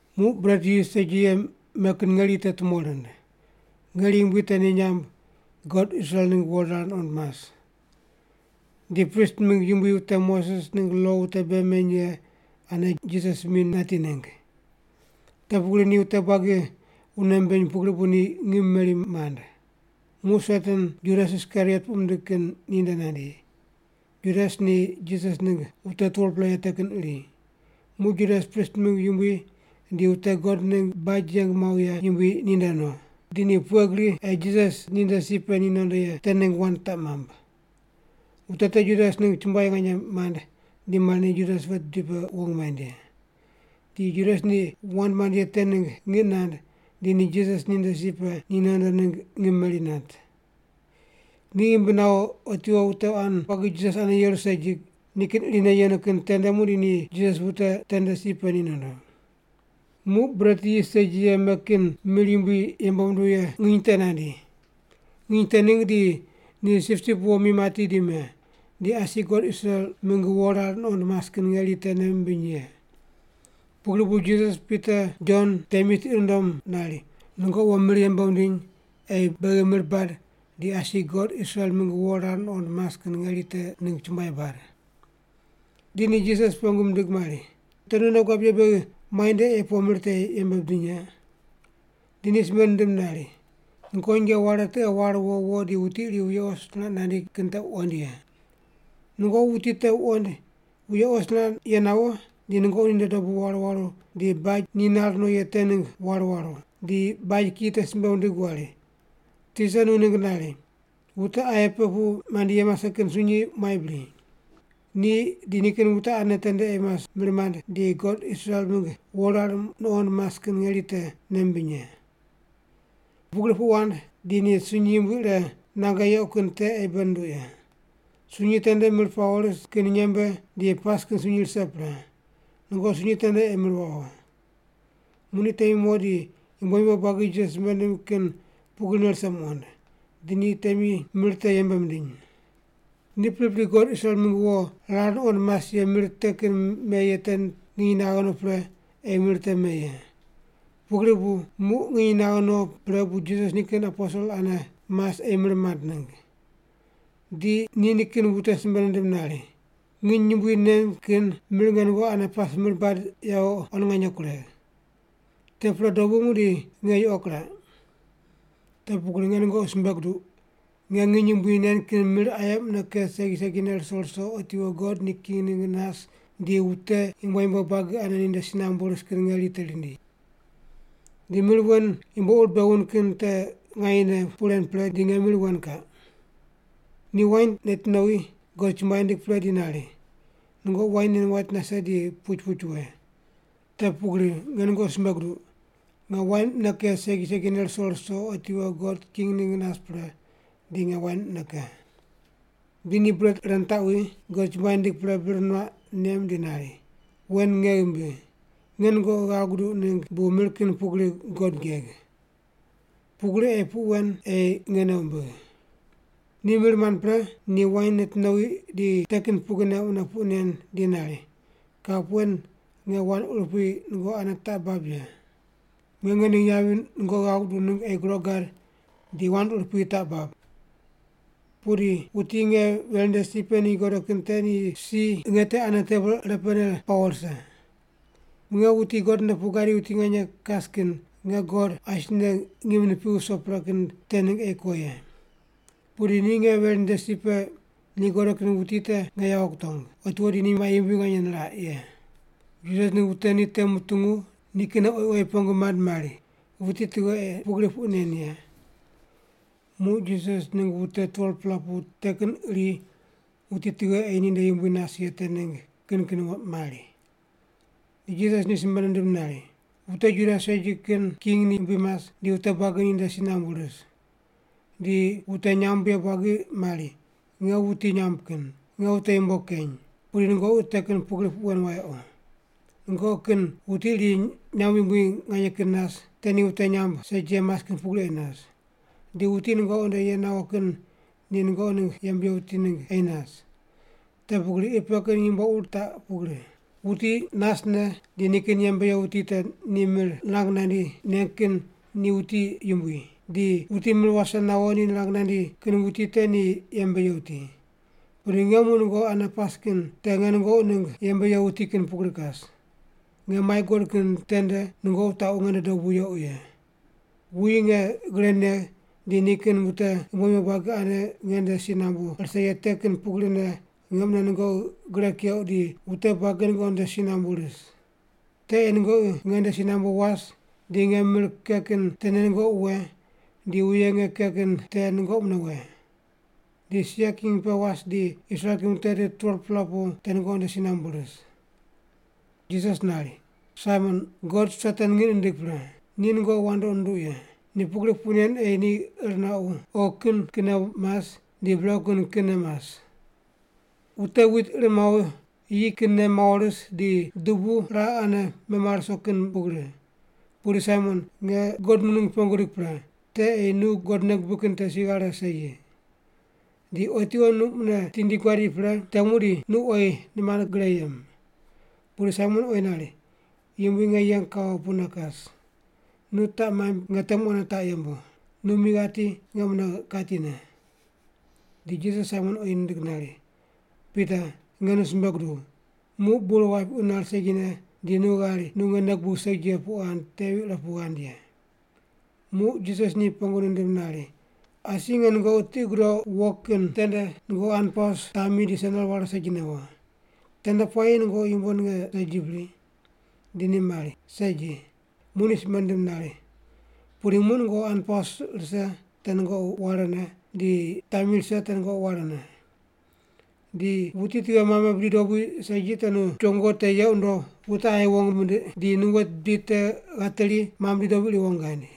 Muq bret yis segi ye me kin ngeri te tumo rind. Ngeri yumbui te ni nyamb, God Israel mingg wo rar nuqond mas. Di prist mingg yumbui wute Moses ningg lo wute bei meny ye ane Jisas mi nati ningg. Te pugri ni wute buagi wune mimbiny pugri bu ni ngim meri mand. Muq Satan Judas, Iskariot puq mindig kin, ninde nandi. Judas ni Jisas ningg wute 12-pela ye te kin iri. Muq Judas prist mingg yumbui di wute God ningg baj yeng muaw ye yumbui ninde no, di ni pughe gri ei Jisas ninde si pe ni nondo ye te ningg wand taq mamb. Wute te Judas ningg chumbuai nganye mand di mari ni Judas wet bidi pe wong maind ye. Di Judas ni wand mand ye te ningg ngiq nand di ni Jisas ninde si pe ni nondo ningg ngim meri nat. Ni ghimbi nawo otiwo wute quan buagi Jisas ane yeru segi, nikin irine yenu kin tende muqdi ni Jisas wute tende si pe ni nondo. Muq bret yis segi ye me kin mir yumbui yembe munduw ye nginy te nandi. Nginy te ningg di ni sipsip wo mi mati di me, di asi God Israel mingg wo rar nuqond mas kin ngeri te nei mimbiny ye. Pugri bu Jisas Pita Jon temi tiqi nundom nari, “Nungoqi wo mir yembe wundiny ei beghi mir bad di asi God Israel mingg wo rar nuqond mas kin ngeri te ningg chumbuai bad.” Di ni Jisas pengu mindig mari, “Te nu nei guab ye beghi muainde ei po mir te yembe bidiny ye?” Di ni simbe nindim nari, “Nungoqi nyinge ware tiqe war wo wo di wuti iri wuye os niraq nandi kin te wuqoind ye. Nungoqi wuti te wuqoind wuye os niraq ye nawo, di nungoqi ninde dobu waru waru di baj ni nar no ye te ningg war waru, di baj kiyi te simbe wundig wari, ‘Tisa nu ningg nari, wute aye pe pu mandi ye mase kin sunyi muai bri? Ni di nikin wute ane tende ei mas mir mand di God Israel mingg wo rar nuqond mas kin ngeri te nei mimbiny ye.’ Pugri puq wand di ni sunyi yumbui ire nange yequ kin te ei bei nunduq ye. Sunyi tende mir pawo ris kin nyembe di pas kin sunyi rise pre. Nungoqi sunyi tende ei mir wawo.” Muq ni temi mo di yumbo yumbo buagi Jisas simbe nindim kin pugrine rise muqond. Di ni temi mir te yembe mindiny. Ni pripri God Israel mingg wo rar nuqond mas ye mir te kin me ye te nginy naghe no pre ei mir te me ye. Pugri bu muq nginy naghe no pre bu Jisas nikin aposel ane mas ei mir mand ningg. Di ni nikin wute simbe nindim nari, “Nginy yumbui nen kin mir nge nungoqi ane pas mir bad yawo quan nganye kuregh. Te pre dobu muqdi nge yuqo kiraq. Te pugri nge nungoqi simbe guduq, nge nginy yumbui nen kin mir aye mune ke segi segine ruso ruso otiwo God ni king ningg nas di wute yumbo yumbo buagi ane ninde si nambu ris kin ngeri te rindi. Di mir wen yumbo ur bei wund kin te nganyene puq ren pre di nge mir wen kaq.” Ni wain neti nowi, God chumbuai nindig pre di nari, “Nungoqi wain nen wait nase di puch puch we. Te pugri nge nungoqi simbe guduq, nge wain mune ke segi segine ruso ruso otiwo God king ningg nas pre di nge wain mune ke.” Di ni bret ire nitaqwi, God chumbuai nindig pre bir nuaq nem di nari, “Wen nge ghimbi. Nge nungoqi ghav guduq ningg bu mir kin pugri God geg. Pugri ei puq wen ei nge nei wumbigh.” Ni mir mand pre, ni wain neti nowi di te kin pugrine mune puq nen di nari, “Kap wen nge wand urupui nungoqi ane taq bab ye. Nge ngening yavi nungoqi ghav guduq ningg ei groq gad di wand urupui taq bab. Pudi wuti nge veri nde si pe ni godo kin te ni si nge te ane tebol ire pene pawo rise. Nge, wuti God nde pu gadi wuti nganye kas kin, nge God asine ngim nipigh wuso pre kin te ningg ei ko ye. Pudi ni nge veri nde si pe ni godo kin wuti te nge yawo kutong, otiwo di ni mai yumbui niraq ye.” Jisas ningg wute ni te mutungu nikinne oyi oyi pengu mand mari, “Wuti tughe ei pugri puq nen ye?” Muq Jisas ningg wute 12-pela pu te kin iri wuti tughe ei ninde yumbui nas ye te ningg kin kin mari. Di Jisas ni simbe nindim nari, “Wute Juda segi kin king ni yumbui mas di wute buagi ninde si nambu ris. Di wute nyamb ye buagi mari, ‘Nge wuti nyamb kin, nge wute yumbo keny.’ Pudi nungoqi te kin pugri puq wen wayequ. Nungoqi kin wuti iri nyamb yumbui nganye kin nas, te ni wute nyamb segi ye mas kin pugri ei nas. Di wuti nungoqi nde ye nawo kin ni nungoqi ningg yembe ye wuti ningg ei nas. Te pugri qi pe kin yumbo ur taq pugri: wuti nasne di nikin yembe ye wuti te ni mir nirang nandi neng kin ni wuti yumbui, di wuti mir wase nawo ni nirang nandi kin wuti te ni yembe ye wuti. Pudi nge muq nungoqi ane pas kin te nge nungoqi ningg yembe ye wuti kin pugri kas. Nge mai guqod kin tende nungoqi wutaqu nge nde dobu yequ ye. Wuyi nge gre negh di nikin wute yumbo yumbo buagi ane nge nde si nambu rise ye te kin pugrine nge mune nungoqi gre keuq di wute buagi nungoqi nde si nambu ris. Te ei nungoqi nge nde si nambu was di nge mir ke kin tene nungoqi we di wuye nge ke kin te nungoqi mune we. Di sia king pe was di Israel kin wute tit 12-pela pu te nungoqi nde si nambu ris.” Jisas nari, “Saimon, God Satan ngiq nindig pre, ni nungoqi wandoqi nundoq ye. Ni pugri puq nen ei ir nuaqu oghi kin kinne mas di brequ kin kinne mas. Wute wit ir mawo yi kinne mawo ris di dubu raqe ane memare ruso kin pugri. Pudi Saimon, nge God nu ningg pengu gidig pre, te ei nu God nei gubig kin te si ghare segi. Di otiwo nu mune tindi guadi pre, te muqdi nu oyi nimand gre yem.” Pudi Saimon oyi nari, “Yumbui, nge yeng kawo pune kas, nu taq maimb nge temu ane taq yembu, nu mi ghati nge mune katine.” Di Jisas Saimon oyi nindig nari, “Pita, nge nu simbe guduw, muq bur wapiqu nari segine di nu ghari nu nge nei gubigh segi puq ghand tevi ire pu ghand ye.” Muq Jisas ni pengu nindim nari, “Asi nge nungoqi tiqi gudouq wo kin tende nungoqi hanpaus, tami di sendel ware segine wo. Tende puayi nungoqi yumbo ninge segi bri?” Di ni mari, “Segi.” Muq ni simbe nindim nari, “Pudi muq nungoqi hanpaus rise te nungoqi warene, di tami rise te nungoqi warene. Di wuti tughe mame bidi dobui segi te nu chongo te yeq wundo wute aye wong mindiq di nu wet bidi te ghateri mame bidi dobui iri wong ghaind.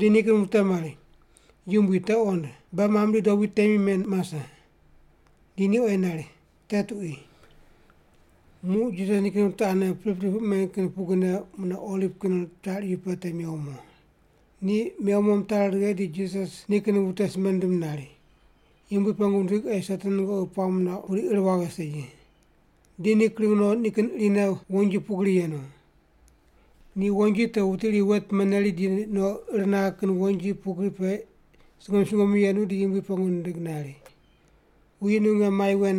Di nikin wute mari, “Yumbui, te qond, beghi mame bidi dobui temi men mase.” Di ni oyi nari, “Te tuqui.” Muq Jisas nikin wute ane pripri puq men kin pugrine mune Oliv kin char iyu pe mewo mo. Ni mewo mo mitari righe di Jisas nikin wute simbe nindim nari, “Yumbui pengu wundig ei Satan nungoqi puamb nuauq, pudi ir waghe segi.” Di ni kring no nikin irine wonji pugri yenu. Ni wonji te wuti iri wet meneri di no ir naghe kin wonji pugri pe sungomyu sungomyu yenu di Yumbui pengu nindig nari, “Wuyi nu nge mai wen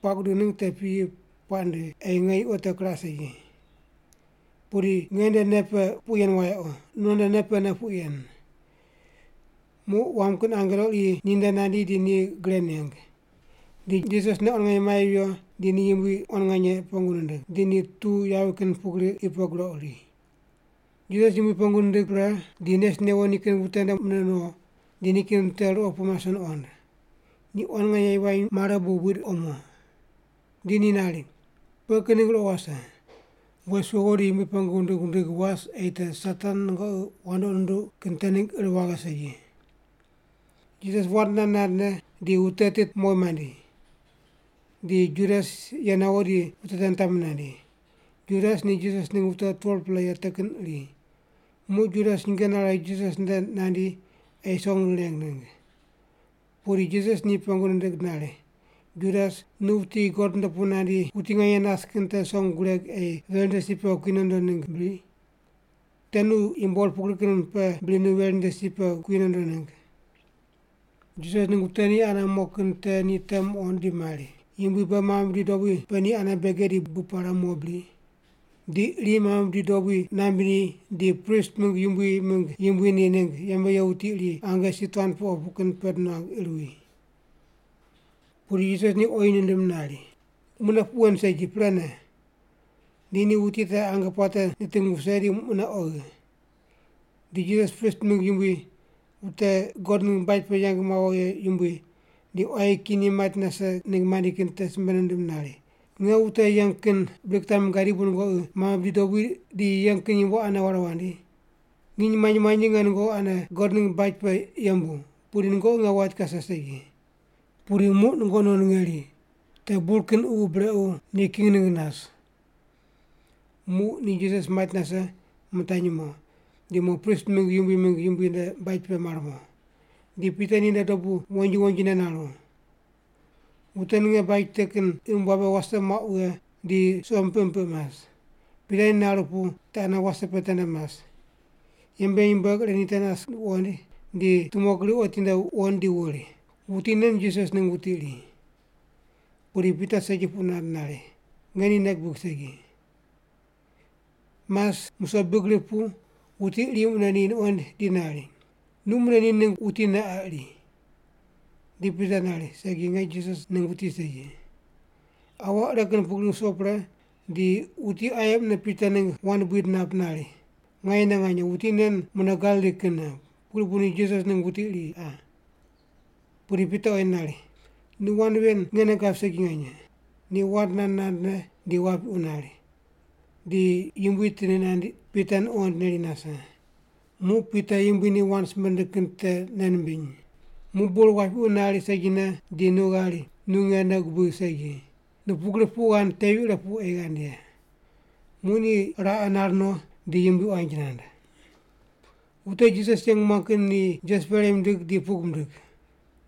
puaq gudigh ningg te piyi puaq ndigh ei nge yuqo te kiraq segi. Pudi nge nde nei pe puq yen wayequ, nu non nde nei pene puq yen.” Muq wam kin angelo iri ninde nandi di ni gre neng. Di Jisas nei quan nganye mai viyo di ni Yumbui quan nganye pengu nindig, di ni tuw yavi kin pugri qi pe groq ri. Jisas Yumbui pengu nindig pre di nes newo nikin wute nde mune no, di nikin wute ruqo pu mase nuqond. Ni quan nganye yivany mare bu buid omo. Di ni nari, “Pughe kin ningg ruqo wase? Wes wewo di Yumbui pengu wundig wundig was ei te Satan nungoqi wandoqi nunduq kin te ningg ir waghe segi.” Jisas wand nand nandne di wute tit mowi mandi. Di Judas ye nawo di wute te nitami nandi. Judas ni Jisas ningg wute 12-pela ye te kin iri. Muq Judas nyinge nare Jisas nde nandi ei song nireng ningg. Pudi Jisas ni pengu nindig nari, “Judas, nu wuti God nde pu nandi wuti nganye nas kin te song gureg ei veri nde si pe kui nondo ningg bri? Te nu yumbo ur pugri kin pe bri nu veri nde si pe kui nondo ningg?” Jisas ningg wute ni ane mo kin te ni te muqond di mari, “Yumbui, beghi mame bidi dobui pe ni ane bege di bub pare mo bri?” Di iri mame bidi dobui naimb ni di prist mingg yumbui mingg yumbui ni ningg yembe ye wuti iri ange si tuan pe opu kin pend nuang ir wi. Pudi Jisas ni oyi nindim nari, “Mune puq wen segi, prene!” Di ni wuti te ange puate niting wuse di mune oghi. Di Jisas prist mingg yumbui, wute God ningg baj pe yeng mawo ye yumbui, di quayi kiyi ni mait nase ningg mandi kin te simbe nindim nari, “Nge wute yeng kin bri kitami gadi bu nungoqi mame bidi dobui di yeng kin yumbo ane wandi? Nginy manyi manyi nge nungoqi ane God ningg baj pe yembu, pudi nungoqi nge wait kase segi. Pudi muq nungoqi non ngeri, te bur kin ququ brequ ni king ningg nas.” Muq ni Jisas mait nase, mitanyi mo, di mo prist mingg yumbui mingg yumbui nde baj pe mar mo. Di Pita ninde dobu wonji wonjine naru. Wute ninge baj te kin imb wabe wase muaq wughe di suqo mipiq mipiq mas. Pita ni naru pu te ane wase pe tende mas. Yembe ye nyumbueg ire ni te nas wuqoind, di tumo gri otinde wuqoind di wuri, “Wuti nen Jisas ningg wuti iri.” Pudi Pita segi puq nand nari, “Nge ni nei gibig segi.” Mas musoq big rip pu wuti iri mune ni nuqoind di nari, “Nu mune ni ningg wutine qa iri.” Di Pita nari, “Segi, nge Jisas ningg wuti segi.” Aua ire kin pugri wuso pre di wuti aye mune Pita ningg wand buid nap nari, “Nganyene nganye, wuti nen mune Galili kinne, pugri bu ni Jisas ningg wuti iri qa.” Pudi Pita oyi nari, “Nu wand ven nge nei gab segi nganye!” Ni wand nand nandne di wapiqu nari. Di Yumbui tindi nandi, Pita nuqoind neri nase. Muq Pita Yumbui ni wand simbe nindig kin te nei nimbiny, “Muq bur wapiqu nari segine di nu ghari nu nge nei gubigh segi. Nu pugri puq ghand tevi ire pu ei ghand ye.” Muq ni raqe nar no di yumbui quanji nand. Wute Jisas yeng muang kin ni Jisas perei mindig di pug mindig.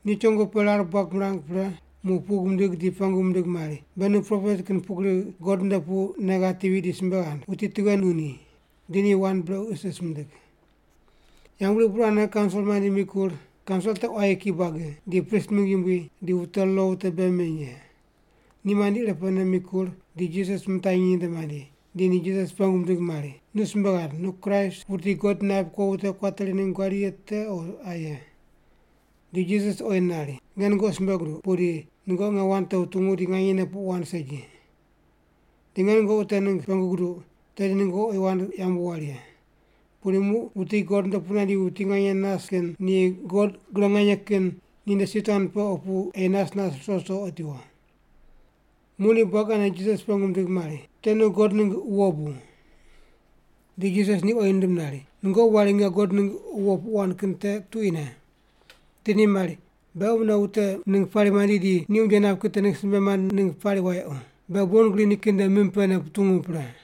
Ni chongo pe rar buag mirang pre muq pug mindig di pengu mindig mari, “Be nu propet kin pugri God nde pu nei ghatevi di simbe ghand, wuti tughe nu ni?” Di ni wand brequ isis mindig. Yambgriq burane kaunsil mandi mikur. Kaunsil te quayi kiyi buagi, di prist mingg yumbui di wute lo wute bei meny ye. Ni mandi irepene mikur di Jisas mitanyi ninde mandi, di ni Jisas pengu mindig mari, “Nu simbe ghand, nu Kraist, wuti God naip kuo wute kuateri ningg guadi ye te o aye?” Di Jisas oyi nari, “Nge nungoqi simbe guduq, pudi nungoqi nge wand te wutungu di nganyene puq wand segi. Di nge nungoqi te ningg pengu guduq, tedi nungoqi oyi wand yambu wari ye. Pudi muq wuti God nde pu nandi wuti nganye nas kin ni God gre nganye kin ninde si tuan pe opu ei nas nas ruso ruso otiwo.” Muq ni buagi ane Jisas pengu mindig mari, “Te nu God ningg wo bu?” Di Jisas ni oyi nindim nari, “Nungoqi wari nge God ningg wo puq wand kin te tuquine.” Di ni mari, “Beghi mune wute ningg pari mandi di ni unje nap kin te simbe mand ningg pari wayequ. Beghi bon gri nikin nde mim pene putungu pre.”